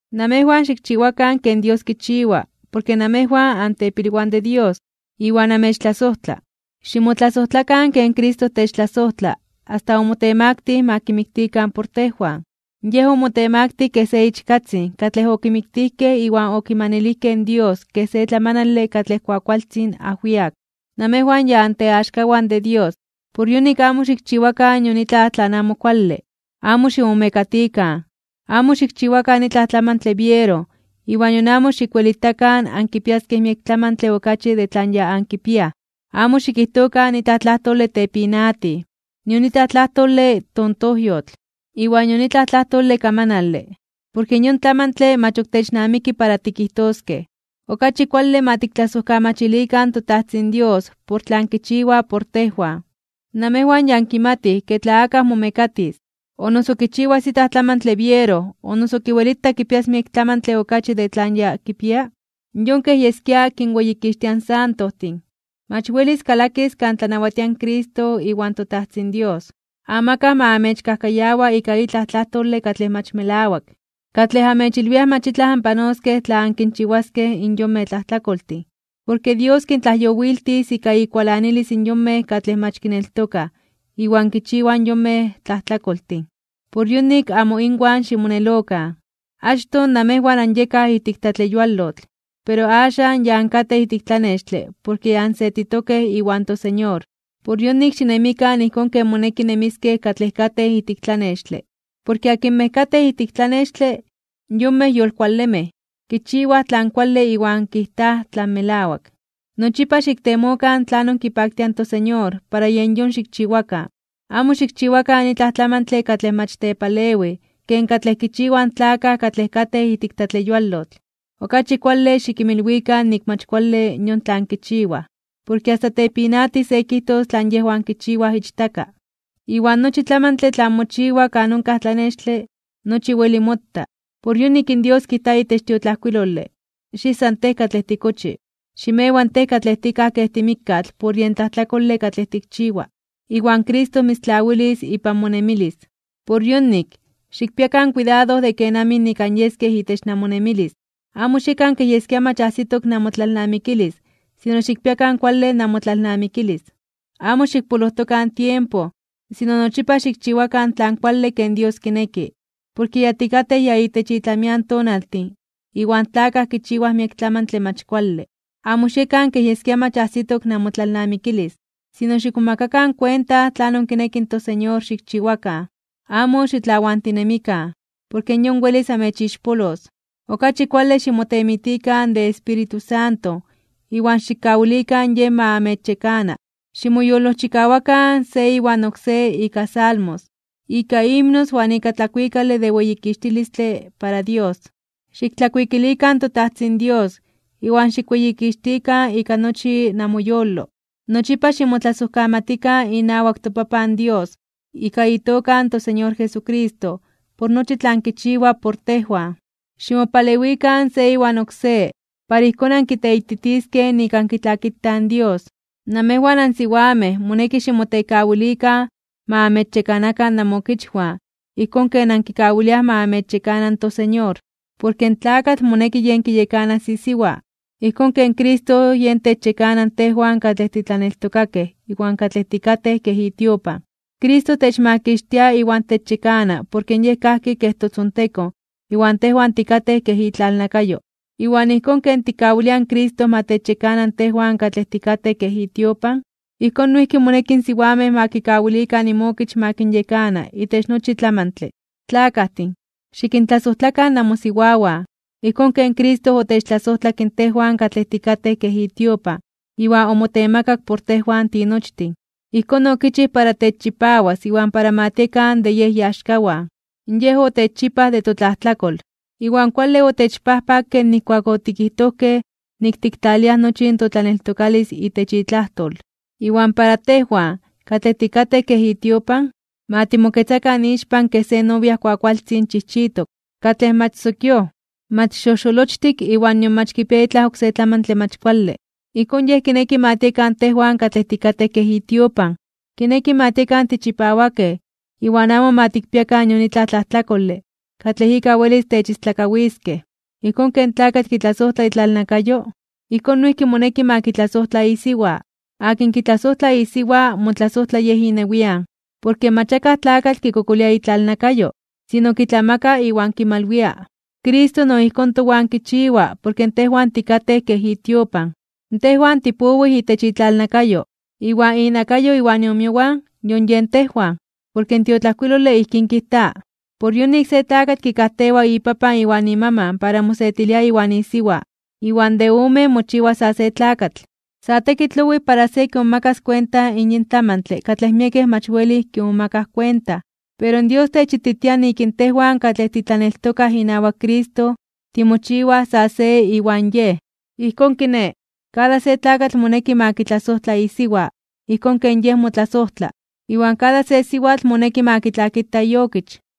Namejwan xikchiwakan ken Dios kichiwa, porke namejwan antepilwan de Dios, iwan amechtlasojtla. Ximotlasojtlakan ken Cristo techtlasojtla asta omotemaktij (omotemaktilij) para ma kimiktikan por tejwan. Yej omotemaktij kej se ichkatzin katlej okimiktijkej iwan okimanilijkej in Dios kej se tlamanale katlej kuakualtzin ajwiak. Namejwan ya anteaxkawan de Dios, por yonik amo xikchiwakan nion itlaj tlan amo kuale. Amo ximomekatikan, amo xikchiwakan itlaj tlamantle biero iwan nion amo xikwelitakan ankipiaskej miek tlamantle okachi de tlan ya ankipiaj. Amo xikijtokan itlaj tlajtole tepinatij, nion itlaj tlajtole tontojyotl, iwan nion itlaj tlajtole kamanale. Porke yon tlamantle mach ok technamiki para tikijtoskej, okachi kuale ma tiktlasojkamachilikan in toTajtzin Dios por tlan kichiwa por tejwan. Namejwan ya ankimatij ke tla akaj momekatis, o noso kichiwas itlaj tlamantle biero o noso kiwelita kipias miek tlamantle okachi de tlan ya kipia, yon kej yeskia kinweyikixtia in santojtin, mach welis kalakis kan tlanawatia in Cristo iwan toTajtzin Dios. Amakaj ma amechkajkayawa ika itlaj tlajtole katlej mach melawak, katlej amechilwiaj mach itlaj anpanoskej tla ankinchiwaskej in yonmej tlajtlakoltin. Porke Dios kintlajyowiltis ika ikualanilis in yonmej katlej mach kineltokaj iwan kinchiwaj in yonmej tlajtlakoltin. Por yonik, amo inwan ximonelokan. Achtoj namejwan anyekaj ijtik tlatleyualotl, pero axan, ya ankatej ijtik tlanextle porke ya ansetitokej iwan toSeñor. Por yonik, xinemikan ijkón ken moneki nemiskej katlej katej ijtik tlanextle. Porke akinmej katej ijtik tlanextle, yonmej yolkualemej, kichiwaj tlan kuale iwan kijtaj tlan melawak. Nochipa xiktemokan tlanon kipaktia in toSeñor para yen yon xikchiwakan. Amo xikchiwakan itlaj tlamantle katlej mach tepalewij ken katlej kichiwaj in tlakaj katlej katej ijtik tlatleyualotl. Okachi kuale xikinmilwikan nik mach kuale yon tlan kichiwaj. Porke asta tepinatij se kijtos tlan yejwan kichiwaj ichtaka. Iwan nochi tlamantle tlan mochiwa kan onkaj tlanextle, nochi weli mota. Por yonik in Dios kijta itech in tiotlajkuilole: Xijsa tej katlej tikochi. Ximewa tej katlej tikaj kej timikkatl por yen tlajtlakole katlej tikchiwa, iwan Cristo mitztlawilis ipan monemilis. Por yonik, xikpiakan kuidado de kenamij nik anyeskej itech namonemilis. Amo xiekan kej yeskia mach ajsitok namotlalnamikilis sino xikpiakan kuale namotlalnamikilis. Amo xikpolojtokan tiempo, sino nochipa xikchiwakan tlan kuale ken Dios kineki, porke ya tikatej ya itech itlamian tonaltin iwan tlakaj kichiwaj miek tlamantle mach kuale. Amo xiekan kej yeskia mach ajsitok namotlalnamikilis, sino xikmomakakan kuenta tlanon kineki in toSeñor xikchiwakan. Amo xitlawantinemikan, porke yon welis amechixpolos. Okachi kuale ximotemitikan de Espíritu Santo iwan xikkawilikan Yej ma amechyekana. Ximoyolojchikawakan se iwan oksé ika salmos, ika himnos iwan ika tlakuikale de weyikixtilistle para Dios. Xiktlakuikilikan toTajtzin Dios iwan xikweyikixtikan ika nochi namoyolo. Nochipa ximotlasojkamatikan inawak toPapan Dios ika itoka in toSeñor Jesucristo por nochi tlan kichiwa por tejwan. Ximopalewikan se iwan oksé, para ijkón ankiteititiskej nik ankitlakitaj in Dios. Namejwan ansiwamej moneki ximotekawilikan ma amechyekanakan namookichwan ijkón ken ankikawiliaj ma amechyekana toSeñor. Porke in tlakatl moneki yen kiyekanas isiwa, ijkón ken Cristo yen techyekana tejwan katlej titlaneltokakej iwan katlej tikatej kej itiopan. Cristo techmakixtia iwan techyekana porke Yej kajki kej totzontekon iwan tejwan tikatej kej itlalnakayo. Iwan ijkón ken tikkawiliaj in Cristo ma techyekana tejwan katlej tikatej kej itiopan, ijkón noijki moneki in siwamej ma kikawilikan inmokich ma kinyekana itech nochi tlamantle. Tlakajtin, xikintlasojtlakan namosiwawan, ijkón ken Cristo otechtlasojtlak tejwan katlej tikatej kej itiopan iwan omotemakak por tejwan tinochtin. Ijkón okichij para techchipawas iwan para ma tiekan de Yej iaxkawan. Yej otechchipaj de totlajtlakol, iwan kuale otechpajpakke nijkuak otikijtojkej nik tiktlaliaj nochi in totlaneltokalis itech itlajtol. Iwan para tejwan, katlej tikatej kej itiopan, ma timoketzakan ixpan kej se novia kuakualtzin chijchitok, katlej mach sokíoj, mach xojxolochtik iwan nion mach kipia itlaj oksé tlamantle mach kuale. Ijkón Yej kineki ma tiekan tejwan katlej tikatej kej itiopan, kineki ma tiekan tichipawakej iwan amo ma tikpiakan nion itlaj tlajtlakole katlej ika welis techistlakawiskej. Ijkón ken tlakatl kitlasojtla itlalnakayo, ijkón noijki moneki ma kitlasojtla isiwa. Akin kitlasojtla isiwa motlasojtla yej inewian. Porke mach akaj tlakatl kikokolia itlalnakayo, sino kitlamaka iwan kimalwia. Cristo no ijkón towan kichiwa porke tejwan tikatej kej itiopan. Tejwan tipowij itech itlalnakayo, iwan inakayo iwan iomiowan yon yen tejwan. Porke in tiotlajkuilole ijkín kijta: “Por yonik se tlakatl kikajtewa ipapan iwan imaman para mosetilia iwan isiwa, iwan de omen mochiwa sa se tlakatl.” Sa tekitl owij para se kimomakas kuenta in yin tlamantle katlej miekej mach welij kimomakaj kuenta, pero Dios techititia nik in tejwan katlej titlaneltokaj inawak Cristo timochiwaj san se iwan Yej. Ijkón kiné, kada se tlakatl moneki ma kitlasojtla isiwa ijkón ken yej motlasojtla, iwan kada se siwatl moneki ma kitlakita iokich.